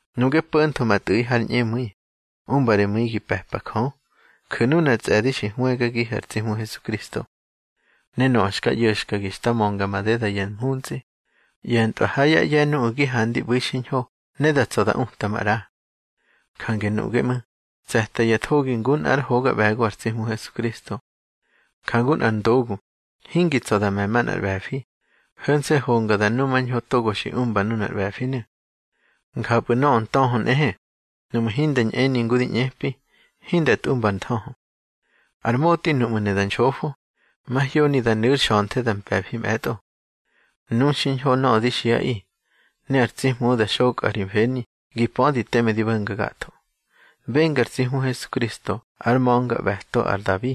Nuꞌge po̱ntho ma tꞌu̱ꞌi har ñꞌemu̱i, umba ri mu̱i gi pe̱pa Jö. Ju̱ nunar tsꞌe̱di xi hwëgagihu̱ ar tsi Hmu Hesukristo. Ne nöꞌö xka ꞌyo̱xkagi xta mönga madeda ya mhuntsꞌi, ꞌye̱ntꞌwa ha yá ꞌye̱ nuꞌu̱ gi handi ꞌbu̱i xiñho ne da tsa̱ da uta maꞌra. Jange nuꞌge ꞌmu̱, tse̱ta ya thogi ngu nꞌár hoga ꞌbe̱go ar tsi Hmu Hesukristo. Jangu nꞌar ndogu hingi tsa̱ da me̱ manꞌar ꞌbe̱fi, ho̱nse̱ honga da numañho togo xi umba nunar ꞌbe̱finu̱. Njapꞌu̱ nöꞌö ntöhö nꞌehe, nuꞌmu̱ hinda ñꞌeni ngu di ꞌñepi, hinda tꞌumba ar nthöhö. Ar motꞌi nuꞌmu̱ ne da nxofo, mahyoni da nu̱ ár xa̱nthe da mpe̱fi mꞌe̱tꞌo. Nu xiñho nöꞌö di xiꞌaꞌi, ne ar tsi Hmu da xokꞌa ri mfeni gi pödi teme di bo̱nga gatho. Benga ar tsi Hmu Hesukristo ár ma̱ngaꞌbe̱to ar Dabi,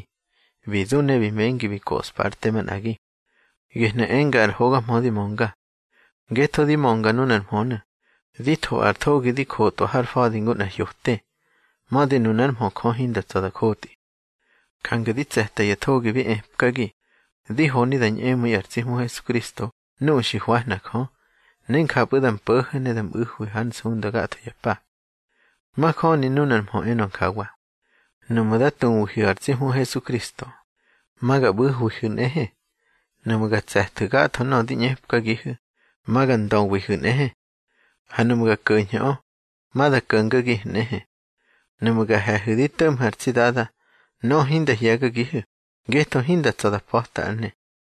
bi du ne bi mengi bi joꞌspa ár te manꞌagi. Gehnu̱ enga ar hoga mhö di mönga. Ngetho di mönga nunar mhönu̱, di tho ar thogi di jotꞌwa har fa̱di ngu nꞌar hyote. Mödi nunár mhö Jö hinda tsa̱ da jotꞌi. Jange di tse̱ta ya thogi bi epkagi, di honi da ñꞌemu̱i ar tsi Hmu Hesukristo nuꞌu̱ xi hwahna Jö, ne njapꞌu̱ da mpo̱ho̱ ne da mꞌu̱hwi hár nsunda gatho ya pa. Majöni nunar mhö enö njawa: Nuꞌmu̱ da tuwihu̱ ar tsi Hmu Hesukristo, ma ga ꞌbu̱hwihu̱ nꞌehe. Nuꞌmu̱ ga tse̱thu̱ gatho nöꞌö di ꞌñepkagihu̱, ma ga ndöwihu̱ nꞌehe. Ha nuꞌmu̱ ga ko̱ñhu̱ꞌö, ma da ko̱ngagihu̱ nꞌehe. Nuꞌmu̱ ga he̱hu̱ di to̱ꞌmhu̱ ar tsi Dada, nöꞌö hinda hye̱gagihu̱, ngetho hinda tsa̱ da pa̱ta ár ne.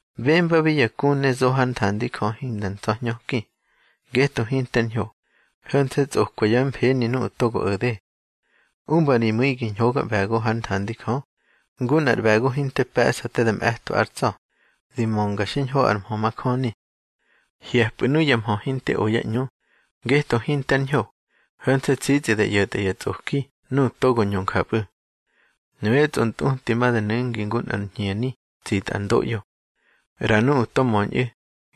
Bembabi ya ku ne zo hár nthandi Jö hinda ntsa̱hñöki, ngetho hinter ñho, ho̱nse̱ tsꞌokwa yá mfeni nuꞌu̱ to o̱de. Umba ri mu̱i gi ñhogaꞌbe̱go hár nthandi Jö, ngu nꞌar ꞌbe̱go hinte pe̱ꞌsa te da mꞌe̱twa ár tsa̱, di mönga xiñho ar mhö majöni. Hye̱pꞌu̱ nuya mhö hinte o yá ꞌñu, ngetho hinte ár ñho, ho̱nse̱ tsitsꞌi da ꞌyo̱tꞌa ya tsꞌoki nuꞌu̱ togo ñö njapꞌu̱. Nuyá tsꞌontꞌuti ma da nu̱ngi ngu nꞌar hñeni tsitꞌa ar ndoꞌyo. ꞌRa nuꞌu̱ to möñꞌu̱,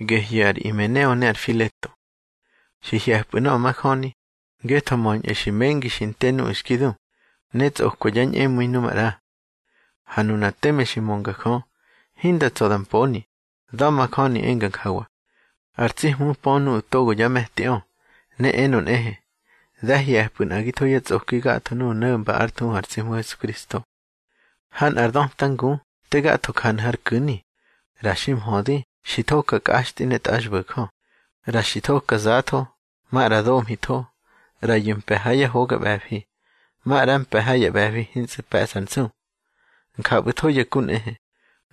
gehyu̱ ar Imeneo ne ar Fileto. Xi hye̱pꞌu̱ nöꞌö majöni, ngetho möñꞌu̱ xi mengi xi nte nuꞌu̱ xki du, ne tsꞌokwa yá ñꞌemu̱i nu maꞌra. Ha nuna teme xi mönga Jö, hinda tsa̱ da mponi, da̱majöni enga njawa: Ar tsi Hmu pö nuꞌu̱ togo yá me̱tiꞌö. Ne enö nꞌehe: Dá hye̱pꞌu̱ nꞌagitho yá tsꞌoki gatho nuꞌu̱ no̱mba ár thuhu ar tsi Hmu Hesukristo. Ha nꞌar döta ngu te gatho janu̱ har ku̱ni, ꞌra xi mhödi xi thoka kꞌaxtꞌi ne tꞌaxbo̱jö, ꞌra xi thoka zatho, maꞌra domhitho. ꞌRayu̱ mpe̱ ha ya hoga ꞌbe̱fi, maꞌra mpe̱ ha ya ꞌbe̱fi hintsꞌu̱ pe̱ꞌsa ár nsu. Njapꞌu̱tho ya ku nꞌehe,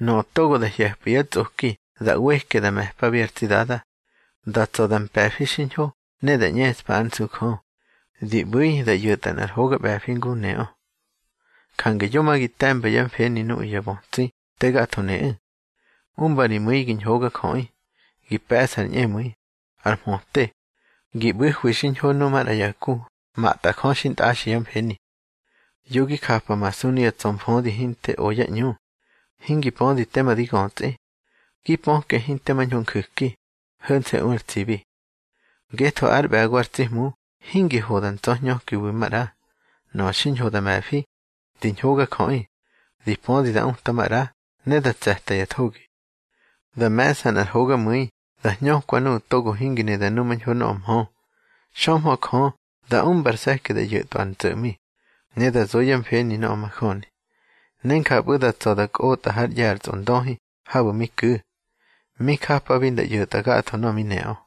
nöꞌö togo da hye̱pꞌu̱ yá tsꞌoki da ꞌweke da me̱pabi ar tsi Dada, da tsa̱ da mpe̱fi xiñho ne da ꞌñeꞌspa ár nsu Jö, di ꞌbu̱i da ꞌyo̱tꞌa nꞌar hoga ꞌbe̱fi ngu neꞌö. Jange yo ma gi te̱mba yá mfeni nuꞌu̱ ya bötsi te gatho neꞌu̱. Umba ri mu̱i gi ñhogajöꞌi, gi pe̱ꞌsa ar ñꞌemu̱i, ar mhöte, gi ꞌbu̱hwi xiñho nuꞌu̱ maꞌra ya ku matꞌa Jö xintꞌaxi yá mfeni. Yo gi japamasu nuya ntsa̱mfödi hinte o yá ꞌñu, hingi pödi tema di götsꞌi. Gi pöke hinte mañho nju̱ki, ho̱nse̱ u ar tsibi. Ngetho ár ꞌbe̱go ar tsi Hmu hingi ho da ntsa̱hñökiwi maꞌra. Nöꞌö xiñho da me̱fi, di ñhogajöꞌi, di pödi da uta maꞌra, ne da tse̱ta ya thogi. Da me̱ꞌsa nꞌar hogamu̱i da hñökwa nuꞌu̱ togo hingi ne da numañho nöꞌö mhö, xömhö Jö da umba ar se̱ki da ꞌyo̱tꞌwa ár ntso̱ꞌmi, ne da zo yá mfeni nöꞌö majöni. Ne njapꞌu̱ da tsa̱ da kꞌotꞌa hár ꞌye̱ ar tsꞌondöhi habu̱ mi ku̱, mi japabi nda ꞌyo̱tꞌa gatho nöꞌö mi neꞌö.